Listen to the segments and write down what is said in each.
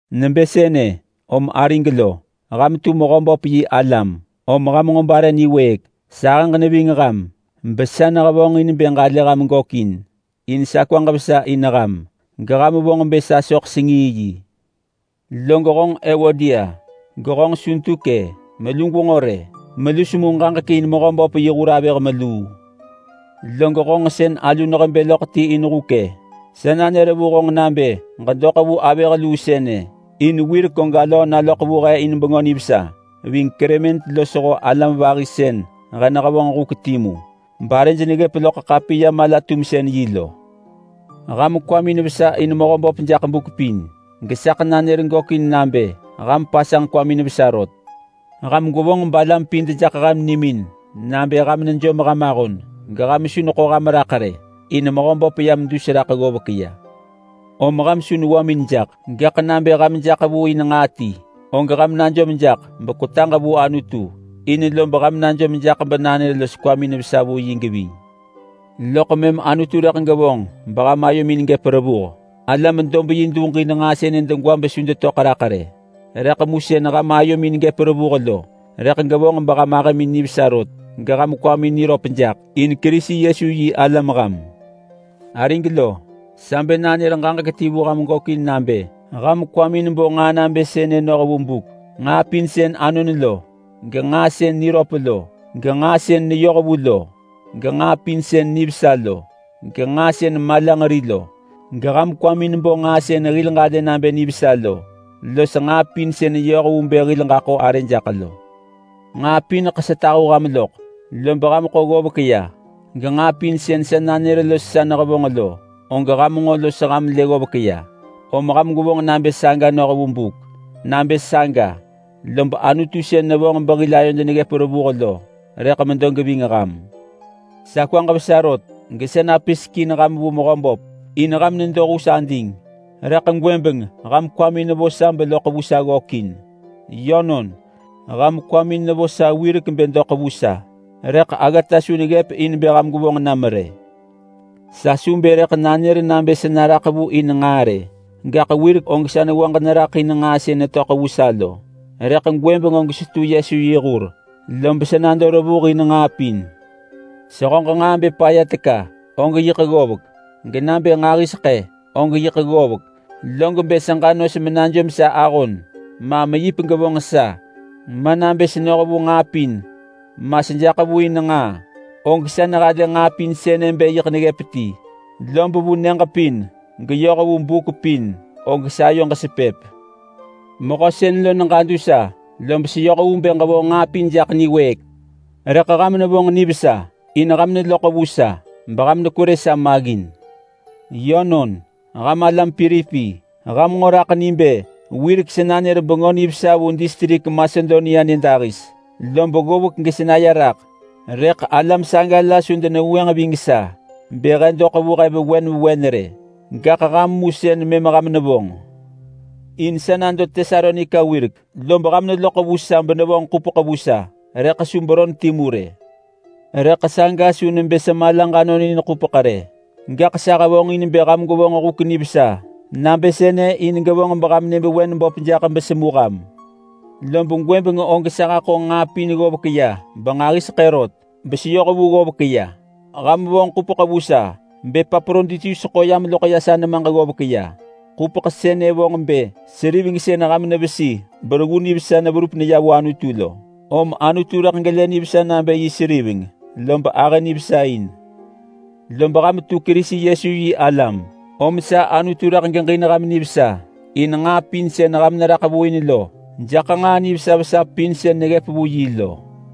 Nebë sënë om arig lo, ham tu Mehöböp yi alam om ham nġo bare niwëëk. Sahëġ neving ham, besa nehevonġin bë ġalë ham gökin. In sa kwaġ vesa in ham, geham vonġ bë sa soḳ sengii yi. Log honġ Ewodia, gehonġ Suntuke, melu gwenġo rë! Melu semu ġaġek in Mehöböp yi hur avëh meluu. Log honġ sën alu nehebë loḳ ti in huk-e! Sa nanër vu honġ nabë ġedoḳ vu avëh luu sënë. In wirek og alöö naloḳ vu he in Bengö Nivesa ving Klement losho alam vahi sën he nehevonġ huk timu barëj neggëp loḳ ḳapiya-mala-tumsën-yi lo. Ham kwamin vesa in Mehöböp jaḳ buk pin, gesaḳ nanër gökin nabë ham pasanġ kwamin vesa rot. Ham gwevonġ balam pin dejaḳ ham nimin nabë ham nejom ham ahon, geham su neḳo ham raḳ rë. In Mehöböp yam dus raḳ ggovek ya. Om ham su newamin jaḳ! Gaḳ nabë ham jaḳ vu in nġaa ti, og ham najom jaḳ bekwetaġ vu Anutu in, lob ham najom jaḳ benanër los kwamin vesa vu yi geving. Loḳ mëm Anutu rëḳ gevonġ beham ayomin gëp revuh. Alam dob-yi duġin nġaa sënë degwa besu detöḳ raḳ rë, rëḳ mu sën ham ayomin gëp revuh lo rëḳ gevonġ beham ahëmin nivesa rot geham kwamin niröp jaḳ in Kerisi Yesu yi alam ham. Arig lo, sa bë nanër ġaġek ti vu ham gökin nabë ham kwamin bo nġaa nabë sënë noh vu buk: Nġaa pin sën anon lo, genġaa sën niröp lo, genġaa sën neyohvu lo, genġaa pin sën nivesa lo, genġaa sën malanġeri lo. Geham kwamin bo nġaa sën hil ġalë nabë nivesa lo los nġaa pin sën yoh vu bë hil ġaḳo arë jaḳ lo. Nġaa pineḳ sa tahu ham loḳ, lob ham ḳo ggovek ya, genġaa pin sën sa nanër los sa nehevonġ lo, og ham nġo los ham lë ggovek ya, om ham gwevonġ nabë saga noh vu buk. Nabë saga, lob Anutu sën nevonġ behil ayod neggëp revuh lo rëḳ medo geving ham. Sa kwaġ vesa rot gesa napisek in ham vu Mehöböp, in ham nedo hus ading rëḳ gwëbeng ham kwamin vo sa beloḳ vu sa ggökin. Yönon, ham kwamin nevo sa wirek bë doḳ vu sa, rëḳ aggata su neggëp in bë ham gwevonġ nam rë. Sa su bë rëḳ nanër nabë sa naraḳ vu in nġaa rë. Gaḳ wirek og sa newaġ neraḳ in nġaa sën netöḳ vu sa lo, rëḳ gwëbeng og setu Yesu yi hur, lob sa nado revuh in nġaa pin. Sehöġ nġaa bë paya teka, og yiḳ ggovek, genabë nġahiseḳë og yiḳ ggovek. Log bë seġa nos menajom sa ahon, ma meyip gevonġ sa, ma nabë senoh vu nġaa pin, ma sejaḳ vu in nġaa, og sa nehalë nġaa pin sënë bë yiḳ neggëp ti, lob vu nyëġ pin geyoh vu buk pin, og sayoġ sepëp. Mehö sën lo neġadu sa, lob seyoh vu bë ġevonġ nġaa pin jaḳ niwëëk. Rëḳ ham nevonġ nivesa, in ham neloḳ vu sa beham nekwerë sa maggin. Yönon, ham alam Pilipi, ham nġo raḳ ni bë wirek sa nanër Bengö Nivesa vu distrik Masedonia nyëdahis lob ggovek gesa naya raḳ, rëḳ alam saga la su denevengwënġ ving sa bë he doḳ vu he vewen vewen rë. Gaḳ ham mu sën mëm ham nevonġ. In sa nado Tesalonika wirek, lob ham neloḳ vu sa benevonġ ḳupeḳ vu sa, rëḳ su beron timu rë. Rëḳ saga su nebë sa malaġ anonin ḳupeḳ rë. Gaḳ sa hevonġin bë ham gwevonġ huk nivesa nabë sënë in gevonġ beham nyëvewen böp jaḳ besemu ham. Lob gwëbeng og sa haḳo nġaa pin ggovek ya benġahiseḳë rot, beseyoh vu ggovek ya. Ham vonġ ḳupeḳ vu sa bEpaproditus ḳo yam loḳ ya sa nemaġ ggovek ya. Ḳupeḳ sënë vonġ bë seriveng sën ham nevesi bereggu nivesa verup neya vu Anutu lo. Om Anutu rëḳ gelë nivesa nabë yi seriveng, lob ahë nivesa in. Lob ham tu Kerisi Yesu yi alam, om sa Anutu rëḳ geġin ham nivesa in nġaa pin sën ham neraḳ vu in lo jaḳ nġaa nivesa vesa pin sën neggëp vu yi lo.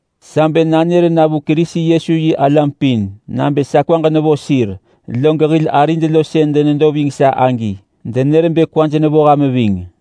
Sa bë nanër na vu Kerisi Yesu yi alam pin nabë sa kwaġ nevo sir. Log hil arid lo sën denedo ving sa agi denër bë kwaj nevo ham ving.